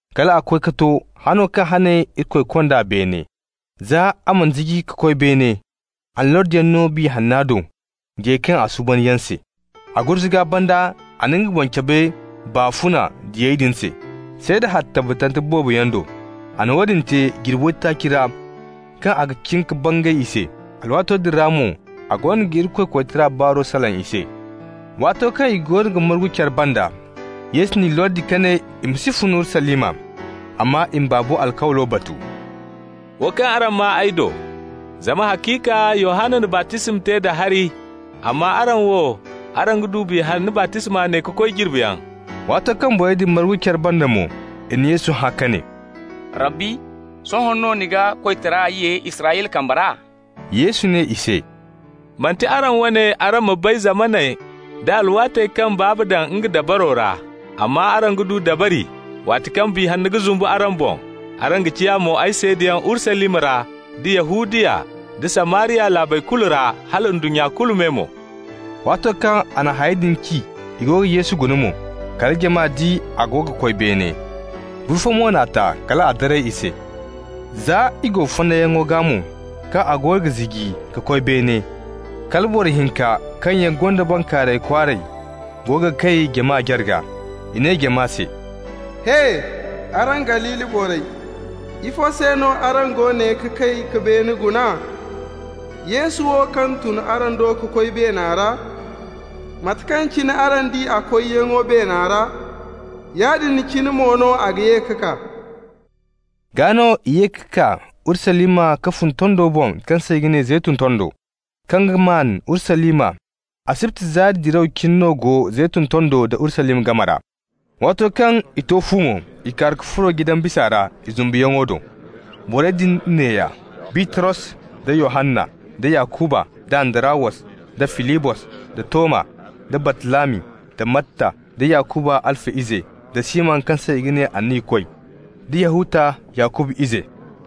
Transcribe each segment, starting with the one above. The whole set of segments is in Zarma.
kal a koy ka to hano kaŋ hane Irikoy kond'a beene. Za a mana ziji ka koy beene, a na lordiyaŋ no Biya Hanna do, diyey kaŋ a suuban yaŋ se. A gurzuga banda a na nga boŋ cabe baafuna diyey din se, seeda hari tabbatante boobo yaŋ do. A na woodin te jirbi waytaaci ra kaŋ a ga cin ka bangay i se. Alwaato din ra mo a goono ga Irikoy koytara baaro salaŋ i se. Waato kaŋ i goono ga margu care banda, Yesu n'i lordi ka ne i ma si fun Urusalima, amma i ma Baabo alkawlo batu, «wo kaŋ araŋ maa ay do. Zama haciika, Yohanna na baptisma te da hari, amma araŋ wo, araŋ ga du Biya Hanna baptisma ne ka koy jirbiyaŋ.» Waato kaŋ borey din margu care banda mo, i na Yesu hã ka ne: «Rabbi, sohõ no ni ga koytara ye Israyla kambe ra?» Yesu ne i se: «Manti araŋ wane araŋ ma bay zamaney da alwaatey kaŋ Baaba daŋ nga dabaro ra. Amma araŋ ga du dabari, waati kaŋ Biya Hanna ga zumbu araŋ boŋ. Araŋ ga ciya mo ay seedayaŋ Urusalima ra, da Yahudiya da Samariya laabey kulu ra, hala ndunnya kulu me mo.» Waato kaŋ a na hayey din ci, i go ga Yesu guna mo, kala jama di a go ga koy beene. Buru fo mo n'a ta kal a daray i se. Za i go fonnayyaŋo gaa mo, kaŋ a goono ga ziji ka koy beene, kala boro hinka kaŋ yaŋ gonda bankaaray kwaaray go ga kay jama jarga. I ne jama se: «He! Araŋ Galili borey, ifo se no araŋ go ne ga kay ka beene guna? Yesu wo, kaŋ tun araŋ do ka koy beena ra, mate kaŋ cine araŋ di a koyyaŋo beena ra, yaadin cine mo no a ga ye ka kaa.» Gaa no i ye ka kaa Urusalima ka fun tondo boŋ kaŋ se i ga ne Zeytun Tondo, kaŋ ga maan Urusalima. Asibti zaari diraw cine no go Zeytun Tondo da Urusalima game ra. Waato kaŋ i to fu mo, i kaaru ka furo jidan bisa ra, i zumbuyaŋo do. Borey din neeya: Bitros da Yohanna, da Yakuba, da Andarawos, da Filibos, da Toma, da Bartalami, da Matta, da Yakuba Halfa ize, da Siman kaŋ se i ga ne Anniyakoy, da Yahuta Yakuba ize.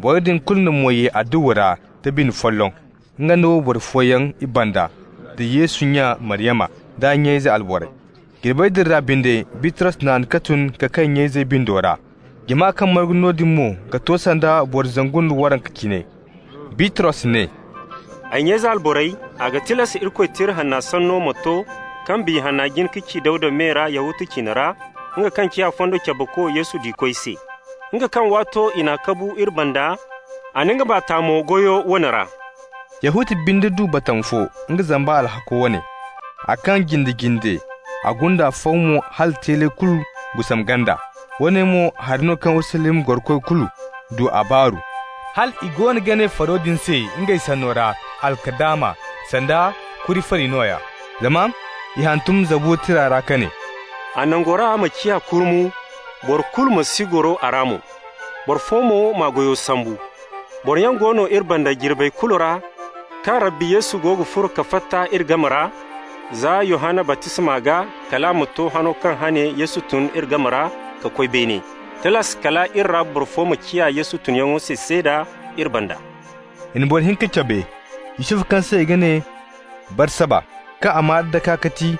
Borey din kulu na mo ye adduwa ra da bine folloŋ, ngey da wayboro fooyaŋ i banda, da Yesu nya Maryama, d'a nya ize alborey. Jirbey din ra binde, Bitros naan ka tun ka kay nya-izey bindo ra, (jama kaŋ margu noodin mo ga to sanda boro zangu nda waranka cine). Bitros ne: «Ay nya-ize alborey, a ga tilas Irikoy Tira Hanna sanno ma to kaŋ Biya Hanna jin ka ci Dawda me ra Yahuta ciine ra, nga kaŋ ciya fondo cabeko Yesu diikoy se. Nga kaŋ waato i n'a kabu iri banda, a na nga baa ta mo goyo woone ra. Yahuta binde du batama fo, nga zamba alhakko wane. A kaŋ jinde-jinde, a gunda faw mo hal a teeley kulu gusam ganda. Woone mo hari no kaŋ Urusalima gorokoy kulu du a baaru, hal i goono ga ne faro din se ngey sanno ra Alkadama, sanda kuri fari nooya. Zama i hantum Zabura tira ra ka ne: ‹A nangora ma ciya kurmu, boro kulu ma si goro a ra mo. Boro fo mo m'a goyo sambu.› Boroyaŋ go no iri banda jirbey kulu ra kaŋ Rabbi Yesu go ga furo ka fatta iri game ra, za Yohanna baptisma gaa kal a ma to hano kaŋ hane Yesu tun iri game ra ka koy beene. Tilas kal i ra boro fo ma ciya Yesu tunyaŋo se seeda iri banda.» I na boro hinka cabe, Yusufu kaŋ se i ga ne Barsaba, kaŋ a maa-daka ga ti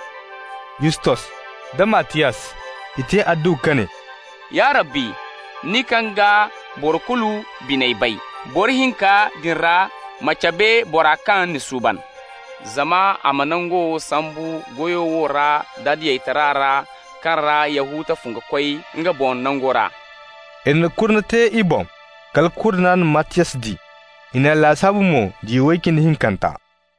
Yustos, da Mattiyas. I te adduwa ka ne: «Ya Rabbi, nin kaŋ ga boro kulu biney bay, boro hinka din ra, ma cabe bora kaŋ ni suuban, zama a ma nangu wo sambu goyo wo ra da diyataray ra kaŋ ra Yahuta fun ka koy nga boŋ nango ra.» I na kurne te i boŋ. Kala kurna na Mattiyas di. I n'a lasaabu mo diya way cindi hinkanta.